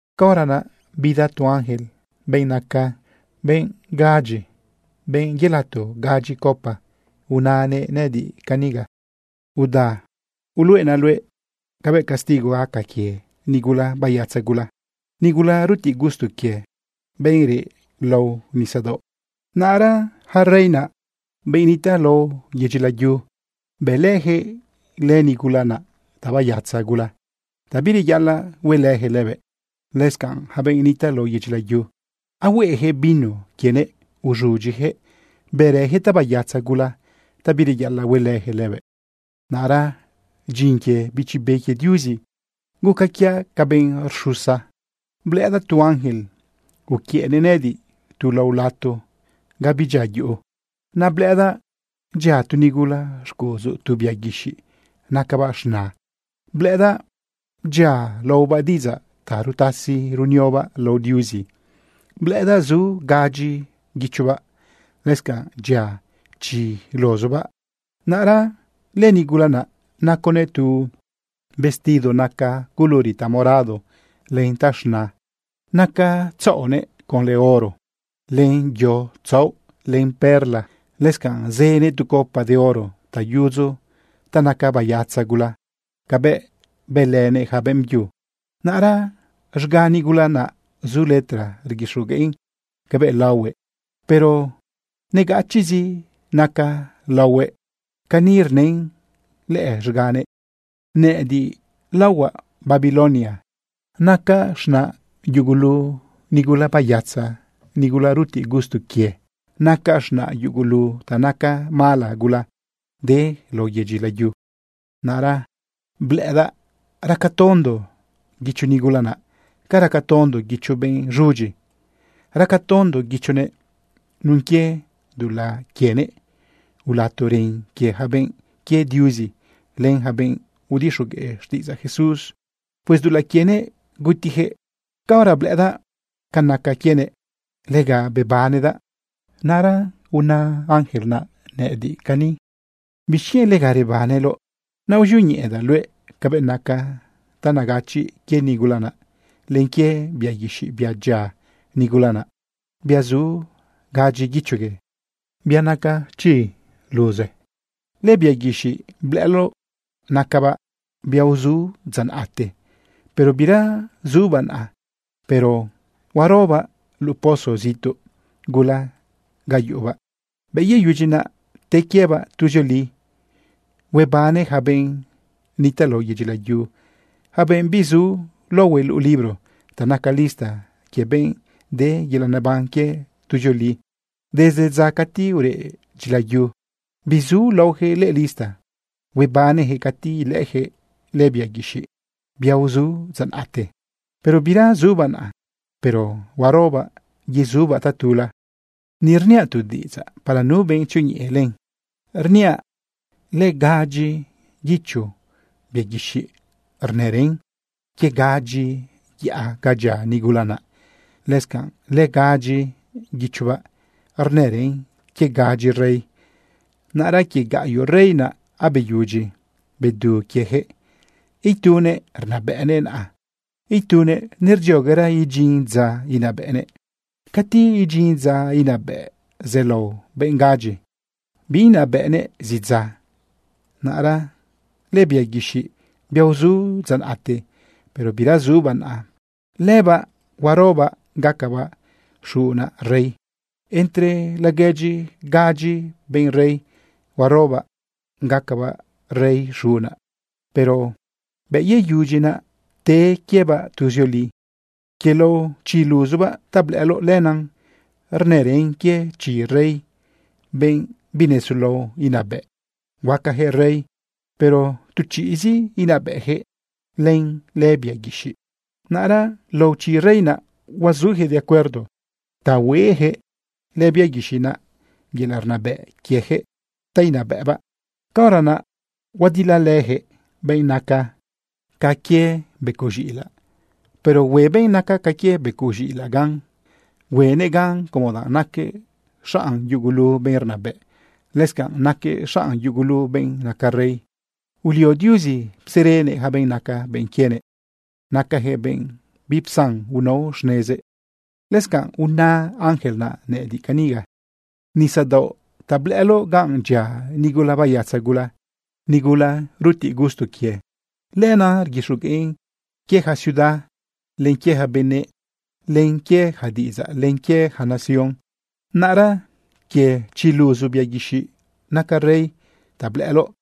Caora naꞌ bida tu ángel, benꞌ naca gadyi benꞌ yelato gadyi copa unanëꞌ nëꞌëdiꞌ caniga: ―Uda, uluꞌenaꞌ luëꞌ cabëꞌ castigo gaca quie nigula bayatza gula, nigula rutiꞌ gusto quie, benꞌ reꞌ lao nisadaoꞌ. Naꞌra ja rey naꞌ, benꞌ nitaꞌ lao yedyi layu, bëlëjëꞌ lënigula naꞌ tabayatza gula, ta bireyaꞌalaꞌ huelëjëꞌ lëbëꞌ. Lëscanꞌ ja benꞌ nitaꞌ lao yedyi layu, ahueꞌejëꞌ vino quienëꞌ uz̃udyijëꞌ bërëjëꞌ tabayatza gula ta bireyaꞌalaꞌ huelëjëꞌ lëbëꞌ. Naꞌra dyin quie Bichi Be quie Diuzi guca quiaꞌ ca benꞌ uxusa blëꞌëdaꞌ tu ángel uquiëꞌnëꞌ nëꞌëdiꞌ tu lao lato ga bidyia yuꞌu. Naꞌ blëꞌëdaꞌ dyia tu nigula xcuꞌudzu tu bia guixiꞌ nacabaꞌ z̃na. Blëꞌëdaꞌ dyia laobaꞌ diꞌidzaꞌ ta rutasi runiobaꞌ lao Diuzi. Blëꞌëdaꞌ zu gadyi guichobaꞌ, lëscanꞌ dyia chi luzubaꞌ. Naꞌra lënigula naꞌ naconëꞌ tu vestido naca culuri tamorado len taz̃na. Naca tzaꞌonëꞌ conlë oro, len yo tzaoꞌ, len perla. Lëscanꞌ zënëꞌ tu copa de oro ta yudzu ta naca bayatza gula cabëꞌ bëlënëꞌ ja beꞌmbyu. Naꞌra z̃ga nigula naꞌ zu letra rguixogueꞌn cabëꞌ laohuëꞌ, pero negachiꞌzi naca laohuëꞌ. Cani rnën lëꞌë z̃ganëꞌ: “Nëꞌëdiꞌ laohuaꞌ Babilonia. Nacaꞌ z̃naꞌ yugulu nigula bayatza, nigula rutiꞌ gusto quie. Nacaꞌ z̃naꞌ yugulu ta naca mala gula de lao yedyi layu.” Naꞌra blëꞌëdaꞌ raca tondo guicho nigula naꞌ ca raca tondo guicho benꞌ z̃udyi. Raca tondo guichonëꞌ nun quie dulaꞌ quienëꞌ ulato ren quie ja benꞌ quie Diuzi, len ja benꞌ udixogueꞌ xtiꞌidzaꞌ Jesús. Pues dulaꞌ quienëꞌ gutijëꞌ. Caora blëꞌëdaꞌ ca naca quienëꞌ, lega bebanedaꞌ. Naꞌra unë ángel naꞌ nëꞌëdiꞌ cani: ―¿Bixquienꞌ lega rebaneloꞌ? Naꞌ uzioñeꞌedaꞌ luëꞌ cabëꞌ naca ta negachiꞌ quie nigula naꞌ, len quie bia guixiꞌ, bia dyia nigula naꞌ, bia zu gadyi guichogue, bia naca chi luze. Lëbia guixiꞌ blëꞌëloꞌ, nacabaꞌ bia uzu dza naꞌte, pero bira zubaꞌ naꞌa, pero huarobaꞌ luꞌu pozo zituꞌ gula ga yuꞌubaꞌ. Bëꞌ yeyudyi naꞌ, te quiebaꞌ tuzioli. Huebane ja benꞌ nitaꞌ lao yedyi layu, ja benꞌ bizu laohue luꞌu libro ta naca lista quie benꞌ de yelaꞌ neban quie tuzioli. Desde dza cati ureꞌ dyilayu bizu laojëꞌ lëꞌë lista. Huebanejëꞌ cati ilëꞌëjëꞌ lëbia guixiꞌ, bia uzu dza naꞌte, pero bira zubaꞌ naꞌa, pero huarobaꞌ yezubaꞌ tatula. ’Ni rniaꞌ tu diꞌidzaꞌ para nu benꞌ tzioñeꞌe len. Rniaꞌ lëgadyi guicho bia guixiꞌ rnërën quie gadyi yaꞌa ga dyia nigula naꞌ. Lëscanꞌ lëgadyi guichobaꞌ rnërën quie gadyi rey. Naꞌra quie gaꞌyoꞌ rey naꞌ abeyudyi bedu quiejëꞌ. Itunëꞌ rnabëꞌnëꞌ naꞌa. Itunëꞌ nerdzioguera idyin dza inabëꞌnëꞌ. Cati idyin dza inabëꞌ zelao benꞌ gadyi, biinabëꞌnëꞌ zi dza. Naꞌra lëbia guixiꞌ, bia uzu dza naꞌte, pero bira zubaꞌ naꞌa, lëbaꞌ huarobaꞌ gacabaꞌ xuna rey. Entre laguedyi gadyi benꞌ rey, huarobaꞌ gacabaꞌ rey xuna, pero bëꞌ yeyudyi naꞌ, te quiebaꞌ tuzioli. ’Quie lao chi luzubaꞌ ta blëꞌëloꞌ, lenan rnërën quie chi rey, benꞌ binesulao inabëꞌ. Huacajëꞌ rey, pero tu chiꞌzi inabëꞌjëꞌ len lëbia guixiꞌ. Naꞌra lao chi rey naꞌ huazujëꞌ de acuerdo ta hueꞌjëꞌ lëbia guixiꞌ naꞌ yelaꞌ rnabëꞌ quiejëꞌ ta inabëꞌbaꞌ. Caora naꞌ huadilalëjëꞌ benꞌ naca ca quie becoꞌ z̃iꞌilaꞌ, pero hue benꞌ naca ca quie becoꞌ z̃iꞌilaꞌ gan. Huenëꞌ gan como danꞌ naquëꞌ xanꞌ yugulu benꞌ rnabëꞌ, lëscanꞌ naquëꞌ xanꞌ yugulu benꞌ naca rey. Ulio Diuzi pserenëꞌ yaca benꞌ naca benꞌ quienëꞌ. Nacajëꞌ benꞌ bipsan unao xnezëꞌ. Lëscanꞌ una ángel naꞌ nëꞌëdiꞌ caniga: ―Nisadaoꞌ ta blëꞌëloꞌ ganꞌ dyia nigula bayatza gula, nigula rutiꞌ gusto quie, lenaꞌ rguixogueꞌn quie ja ciudad, len quie ja benëꞌ, len quie ja diꞌidzaꞌ len quie ja nación. Naꞌra quie chi luzu bia guixiꞌ naca rey ta blëꞌëloꞌ,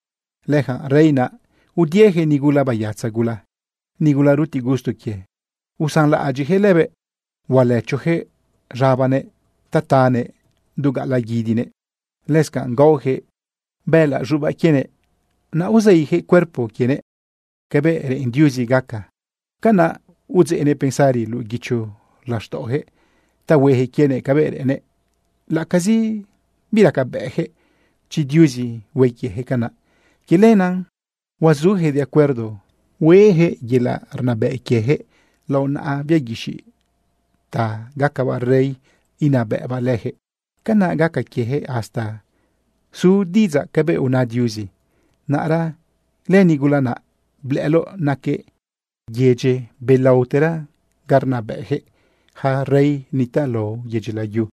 lëyaca rey naꞌ udiejëꞌ nigula bayatza gula, nigula rutiꞌ gusto quie. Usanlaꞌadyiꞌjëꞌ lëbëꞌ. Hualëchojëꞌ z̃abanëꞌ ta tanëꞌ du gaꞌalaꞌ guidinëꞌ. Lëscanꞌ gaojëꞌ bëꞌëlaꞌ z̃ubaꞌ quienëꞌ, naꞌ uzeijëꞌ cuerpo quienëꞌ. Cabëꞌ reꞌen Diuzi gaca, canaꞌ udzeꞌnëꞌ pensari luꞌu guicho laxtaꞌojëꞌ ta huejëꞌ quienëꞌ cabëꞌ reꞌennëꞌ, laꞌacazi biracabëꞌjëꞌ chi Diuzi hue quiejëꞌ canaꞌ. Quie lenaꞌ huazujëꞌ de acuerdo hueꞌjëꞌ yelaꞌ rnabëꞌ quiejëꞌ lao naꞌa bia guixiꞌ ta gacabaꞌ rey inabëꞌbaꞌ lëjëꞌ. Canaꞌ gaca quiejëꞌ hasta izu diꞌidzaꞌ cabëꞌ una Diuzi. Naꞌra lënigula naꞌ blëꞌëloꞌ, naquëꞌ lëyedyi belaotera ga rnabëꞌjëꞌ ja rey nitaꞌ lao yedyi layu.